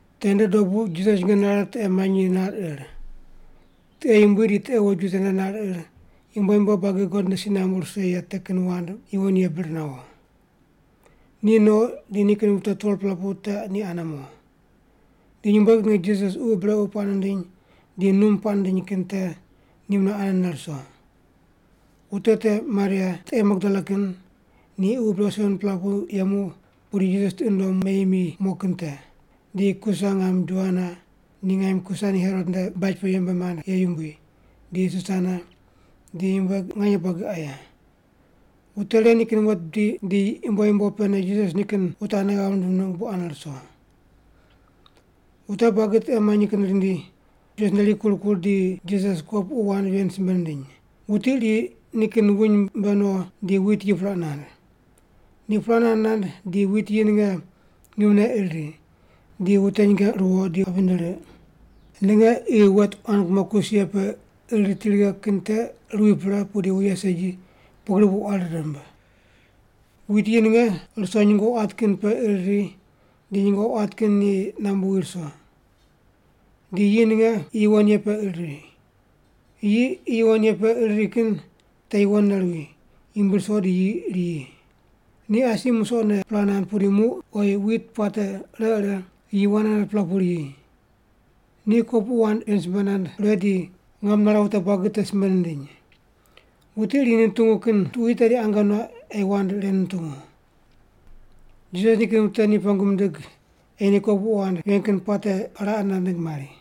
Tende dobu Jisas nyinge nare tiqe manyi nar ir. Tiqe yumbui di tiqe woju tende nar ir yumbo yumbo buagi God nde si nambu rise ye te kin wand yuwon ye bir nawo. Ni no di nikin wute 12-pela pu te ni ane mo. Di nyumbueg ninge Jisas ququ brequ puaq nindiny di num puaq nindiny kin te ni mune anene ruso. Wute te, Maria (tiqe Magdala kin) ni ququ brequ 7-pela pu yemu pudi Jisas tiqi nundom meyi mi mo kin te. Di Kusa ngam Joana, ni ngaim Kusa ni Herot nde baj pe yembe mand ye yumbui, di Susana, di nyumbueg nganye buagi aye. Wute ren nikin wet bidi di yumbo yumbo pene Jisas nikin wute ane ghav rindim ningg bu ane ruso. Wute buagi tiqe manyi kin rindi, Jisas nde rikur kur di Jisas kopuqu wand ven simbe nindiny, “Wuti iri nikin wuny mbe no di wit yi puraq nand. Ni puraq nand nand di wit yi ninge ngimne ir ri, di wute nyinge ruwo di wapi rindi riq. Ninge qi wet quan kumo kus ye pe ir riti righe kin te ruwi pre pudi wuye segi, pugri bu quari rimb. Wit yi ninge ruso nyungo quat kin pe ir ri di nyungo quat kin ni nambu wi ruso. Di yi ninge qi yuwon ye pe ir ri. Yi qi yuwon pe ir ri kin te yuwonne ruwi, yumbui ruso di yi riyi. Ni asi musoqne puraq nand pudi muq oyi wit puate ire ire yi 100-pela pugri riyi.” Ni kopuqu wand ven simbe nand pre di ngam nare wute buagi te simbe nindiny, “Wuti iri ni nutungu kin tuqui tedi ange nuaq ei wand ren nutungu.” Jisas nikin wute ni pengu mindig ei ni kopuqu wand ven kin puate raqe nand ningg mari.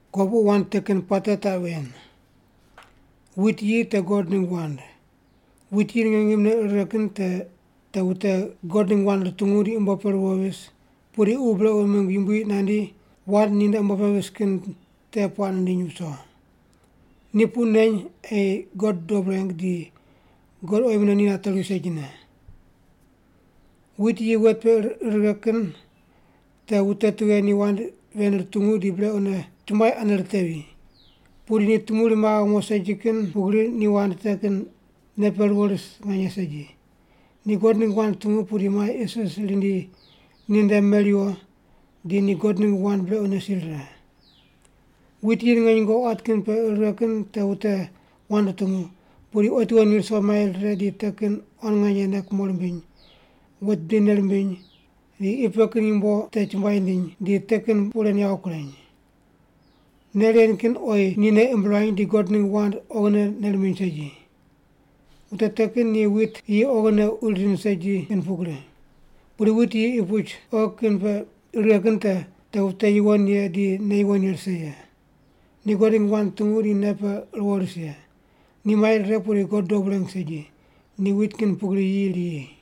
“Kopuqu wand te kin puate taq ven: Wit yi te God ningg wand. Wit yi ninge ngimne ir righe kin te, te wute God ningg wand rutungu di umbo pe ruwo vis, pudi ququ brequ mingg yumbui nandi wand ninde umbo vis kin te puaq nindiny viso. Ni puq neny ei ni God dob reng di God oyi mune ni nateri segine. Wit yi wet pe ir righe kin te wute tughe ni wand ven rutungu di brequne chumbuai ane ritevi. Pudi ni tumuri maghe mo segi kin pugri, ni wand te kin nei pe ruwo ris nganye segi. Ni God ningg wand rutungu pudi mai isis rindi ninde meriwo di ni God ningg wand brequne si rire. Wit yi ninge nyungo quat kin pe ir righe kin te wute wand rutungu, pudi otiwo ni ruso mai rire di te kin quan nganye nei kumo rimbiny, wet bidi nei rimbiny, di qi pe kin yumbo te chumbuai rindiny, di te kin puq ren yawo kureny. Nei ren kin oyi ni nei imb ruany di God ningg wand oghine nei rimbiny segi. Wute te kin ni wit yi oghine uri rind segi kin pugri. Pudi wit yi qi puch oghi kin pe ir righe kin te, te wute yuwon ye di nei yuwon ye rise ye. Ni God ningg wand rutungu di nei pe ruwo ris ye. Ni mai rire pudi God dob reng segi, ni wit kin pugri yi riyi.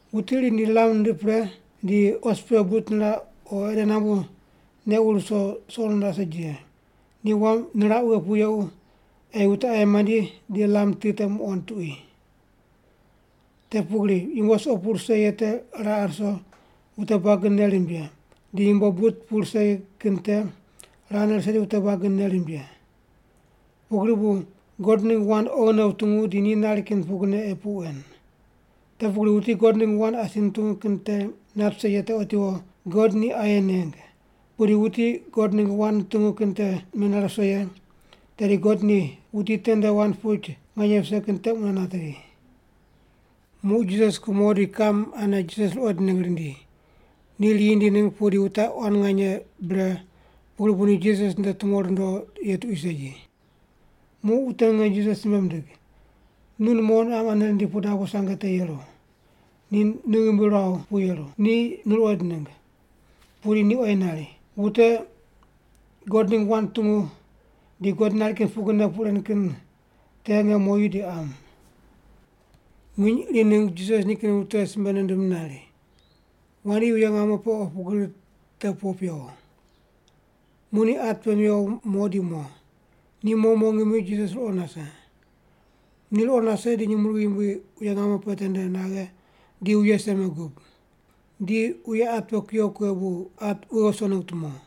“Wuti iri lam nindiq pre di os pe but niraq o ede nambu neq wur wuso suqo niraq segi ye, ni wam niraq wughe pu yequ ei wute aye mandi di lam ti te muqond tuqui. Te pugri yumbo suqo pu rise ye te raqe ruso wute buagi nei rimb ye, di yumbo but pu rise kin te raqene rise di wute buagi nei rimb ye. Pugri bu God ningg wand oghine wutungu di ni nari kin pugrine ei puq wen. Te pugri wuti God ningg wand asi nutungu kin te nat vise ye te otiwo God ni aye neng, pudi wuti God ningg wand nutungu kin te menare viso ye, tedi God ni wuti tende wand puch nganye vise kin te mune natevi.” Muq Jisas kumo di kiqam ane Jisas ruqoind ningg rindi. Ni riyi rindi ningg pudi wute quan nganye bre pugri bu ni Jisas nde tumo rundo ye tuqui segi. Muq wute ninge Jisas simbe mindig, “Nu numo niqam ane rindi pu dabo sange te yeru, ni nu ghimbi ruaw pu yeru. Ni nu ruqoind ningg.” Pudi ni oyi nari, “Wute God ningg wand rutungu di God nari kin pugrine puq ren kin te nge moyu di qam.” Nginy iri ningg Jisas nikin wute simbe nindim nari, “Wandi wuye ngamo pe pu opu gri te po pewo.” Muq ni at pe mewo mo di mo. Ni mo mo ngimi Jisas ruqo nase. Ni ruqo nase di nyumurighi yumbui wuye ngamo pe tende naghe di wuye seme gub. Di wuye at pe kuyo kughe bu at wughe wuso ningg tumo.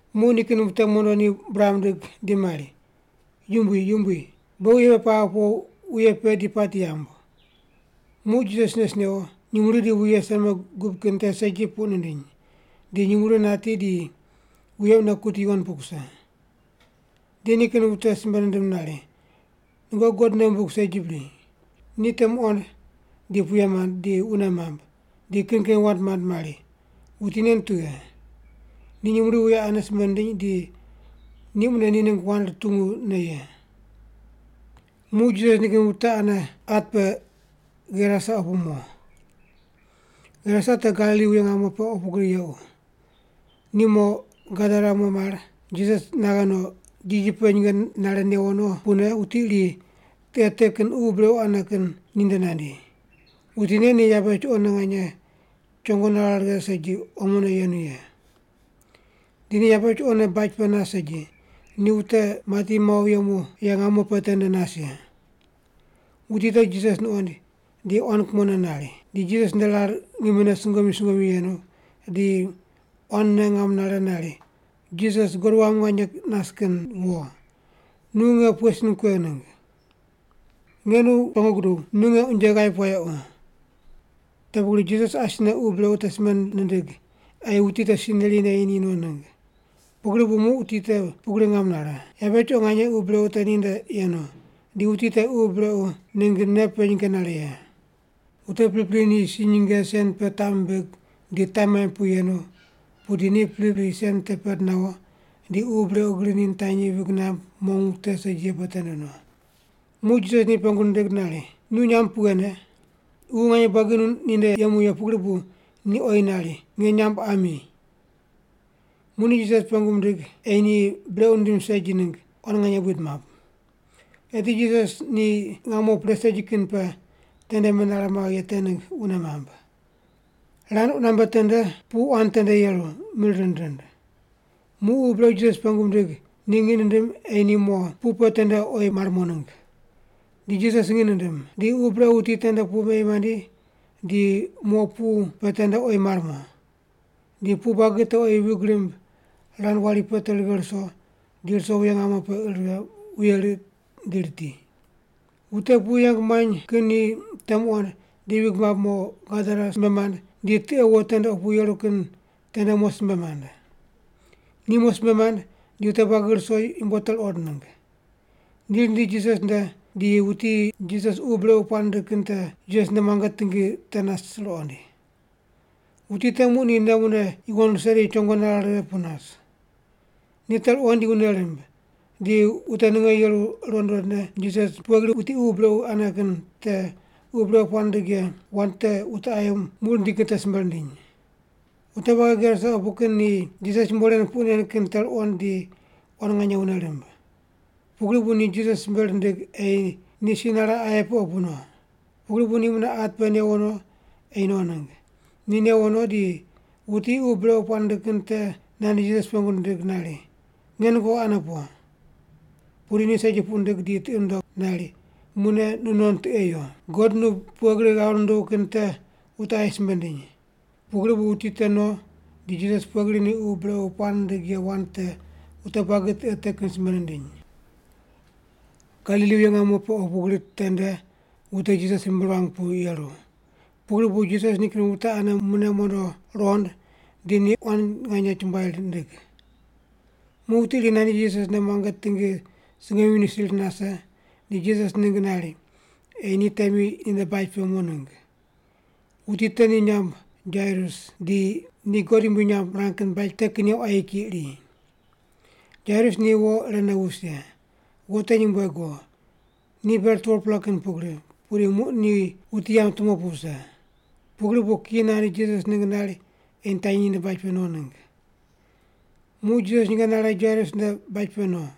Muq nikin wute mondo ni buraq mindig di mari, “Yumbui, Yumbui! Beghi wuye pe paghe po wuye pe di pati yamb.” Muq Jisas nes newo, nyumurighi di wuye seme gub kin te segi puq nindiny, di nyumurighi nati di wuye mune kuti yuwon pu kuse. Di nikin wute simbe nindim nari, “Nungoqi God nei wumbig segi bri?” Ni te muqond, di puye mand, di wune mamb, di kin kin wand mand mari, “Wuti nen tughe? Ni nyumurighi wuye ane simbe nindiny di ni mune ni ningg wand rutungu ne ye!” Muq Jisas nikin wute ane at pe Gerasa opu mo. Gerasa te Galili wuye ngamo pe opu gri yequ. Ni mo Gadara mo mar, Jisas naghe no, jiji pe nyinge nare newo no pune wuti iri tiqe te kin ququ brequ ane kin ni nde nandi. Wuti nen ni yabe chuqone nganye chongo nare righe segi, omone yenu ye. Di ni yabe chuqone baj pe nas segi, ni wute mati mawo yemu ye ngamo pe tende nas ye. Wuti te Jisas nuqoind, di quan kumone nari, di Jisas nde rar ngimine sungomyu sungomyu yenu, di quanne ngam nare nari, “Jisas, God Wam Nganye nas kin wo, nu nge pughe sin kuegh ningg? Nge nu pengu guduw, nu nge unje ghaip wayequ.” Te pugri Jisas asine ququ brequ te simbe nindig ei wuti te si neri neyi ni no ningg. Pugri bu muq wuti te pugri ngam nare. Yabe chuqo nganye ququ brequ te ninde yenu, di wuti te ququ brequ ningg nei pe nyinge nare ye. Wute pripri ni si nyinge sen pe taq mimbig di taq maimb pu yenu, pudi ni pripri sen te pend nawo, di ququ brequ gri ni nitanyi vig namb mong wute segi ye pe tende no. Muq Jisas ni pengu nindig nari, “Nu nyamb pughene?” Ququ nganye buagi ninde yemu ye pugri bu ni oyi nari, “Nge nyamb Ami.” Muq ni Jisas pengu mindig ei ni brequ nindim segi ningg quan nganye buid map. Eti Jisas ni ngamo pre segi kin pe tende menare maghe ye te ningg wune mamb. Rand qunambe tende pu quan tende ruso yeru mir rind rind. Muq ququ brequ Jisas pengu mindig ni ngiq nindim ei ni mo pu pe tende oyi mar mo ningg. Di Jisas ngiq nindim. Di ququ brequ wuti tende pu meyi mandi, di mo pu pe tende oyi mar mo. Di pu buagi te oyi vig rimb, rand wari pe te righe ruso, di ruso wuye ngamo pe ir righe, wuye riq di riti. Wute pu yeng muany kin ni te muqond, di vig mamb mo, Gadara simbe mand di tiqe wo tende opu yeru kin tende mo simbe mand. Ni mo simbe mand, di wute buagi ruso yumbo te ruqond ningg. Ni rindi Jisas nde di wuti Jisas ququ brequ puaq nindig kin te Jisas nde muange tingi te nas ruqoind. Wuti te muq ni nei mune yuwon rise di chongo nare righe pu nas. Ni te ruqond di wune rimb. Di wute ninge yeru ruqond ruqondne Jisas pughe gri wuti ququ brequ ane kin te ququ brequ puaq nindig ye wand te wute aye muq rindi kin te simbe rindiny. Wute buagi Gerasa opu kin ni Jisas yumbo ren puq nen kin te ruqond di quan nganye wune rimb. Pugri bu ni Jisas simbe rindig ei ni si nare aye pe opu no. Pugri bu ni mune at pe newo no ei no ningg. Ni newo no di wuti ququ brequ puaq nindig kin te nandi Jisas pengu nindig nari, “Nge nungoqi ane po.” Pudi ni segi puq nindig di tiqi nundog nari, “Mune nu non tiqe yo, God nu pughe gri ghav nunduw kin te wute aye simbe ndiny.” Pugri bu wuti te no, di Jisas pughe gri ni ququ brequ puaq nindig ye wand te wute buagi tiqe te kin simbe nindiny. Galili wuye ngamo pe opu gri tende wute Jisas ghimbi ruang pu yeru. Pugri bu Jisas nikin wute ane mune mondo ruqond di ni quan nganye chumbuai rindig. Muq wuti iri nandi Jisas nde muange tingi sungomyu nisir nase, di Jisas ningg nari ei ni temi ninde baj pe mo ningg. Wuti te ni nyamb Jairus di ni God yumbui nyamb mirang kin baj te kin ye quayi kiyi iri. Jairus ni wo irene wus ye. Wo te nyumbueg wo, ni ber 12-pela kin pugri, pudi muq ni wuti yamb tumo pu wuse. Pugri bu kiyi nandi Jisas ningg nari ei nitanyi ninde baj pe no ningg. Muq Jisas nyinge nare Jairus nde baj pe no.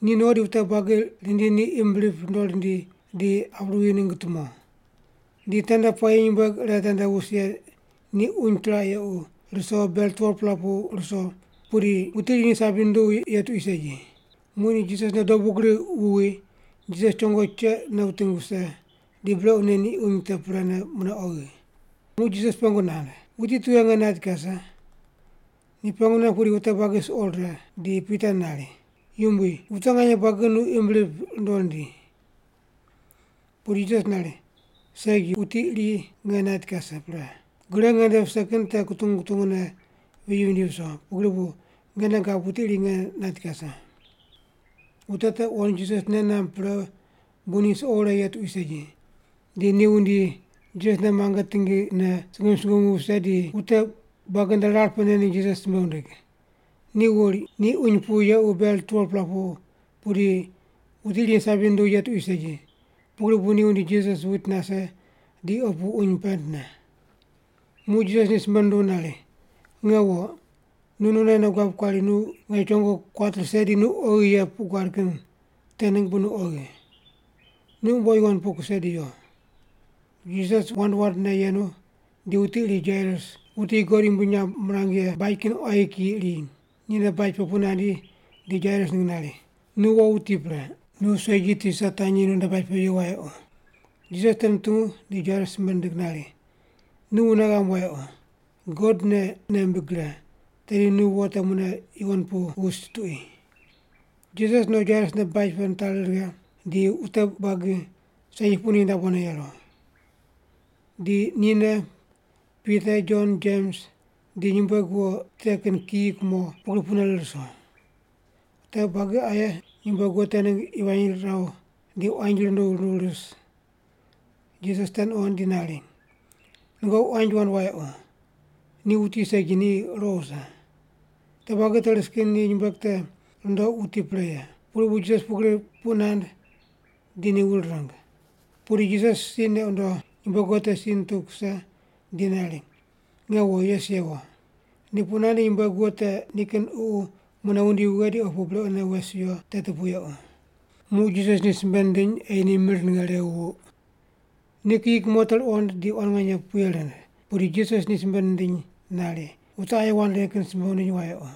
Ni no di wute buagi rindi ni imb rip rundo rindi di ap ruwi ningg tumo. Di tende puayi nyumbueg ire tende wus ye ni uny chiraq yequ ruso ber 12-pela pu ruso, pudi wuti iri ni sabi nunduw ye tuqui segi. Muq ni Jisas nde dobu gri wuwi, Jisas chongo cheqne wuting wuse, di brequne ni uny te prene, mune oghi. Muq Jisas pengu nand, “Wuti tughe nge nait kase?” Ni pengu nand pudi wute buagi suqo rire, di Pita nari, “Yumbui, wute nganye buagi nu imb rip rundo rindi.” Pudi Jisas nari, “Segi, wuti iri nge nait kase pre. Gre ngende vise kin te kutungu kutungu ne viyi vindi viso, pugri bu nge nei gab wuti iri nge nait kase.” Wute te wuqond Jisas nei namb pre bu ni suqo wure ye tuqui segi, di ni wundi Jisas nde muange tingine sungomyu sungomyu wuse, di wute buagi nde rar pene ni Jisas simbe wundig. Ni wuri ni uny pu yequ yequ ber 12-pela pu pudi wuti iri ni sabi nunduw ye tuqui segi, pugri bu ni wundi Jisas wuit nase di opu uny pendne. Muq Jisas ni simbe nunduw nari, “Nge wo, nu nonne nei guab kuari nu nge chongo kuat rise di nu oghi ye puq guad kin te ningg bu nu oghi. Nu umbo yuwon pu kuse di yo.” Jisas wand wandne yenu di wuti iri Jairus, wuti God yumbui nyamb mirang ye baj kin quayi kiyi iri, ninde baj pe pu nandi di Jairus ningg nari, “Nu wo wuti pre. Nu segi Tisa tanyi nunde baj pe yo wayequ.” Jisas te nutungu di Jairus simbe nindig nari, “Nu wune ghamb wayequ. God ne nei mbig gre, tedi nu wo te mune yuwon pu wus tuqui.” Jisas no Jairus nde baj pe nitari righe di wute buagi segi puq nindiny dabone yeru. Di nine, Pita, Jon, Jems, di nyumbueg wo te kin kiyi kumo pugri pune rir ruso. Wute buagi aye nyumbueg wo te ningg yivany riraw di quanji runduw runduw ris. Jisas te nuqond di nari, “Nungoqi quanji wand wayequ, ni wuti segi, ni ruqo wuse.” Wute buagi te ris kin ni nyumbueg te rundoq wuti pre ye. Pugri bu Jisas pugri puq nand di ni wur ring. Pudi Jisas si neq wundo, nyumbueg wo te si nituw kuse di nari, “Nge wo, yes yewo!” Ni puq nand di nyumbueg wo te nikin ququ mune wundi wughe di opu brequne wes wiyo teti pu yequ. Muq Jisas ni simbe nindiny ei ni mir ninge rew wuq. Ni kiyi kumo te ruqond di quan nganye puye rind, pudi Jisas ni simbe nindiny nari, “Wute aye wand ren kin simbe wundiny wayequ.”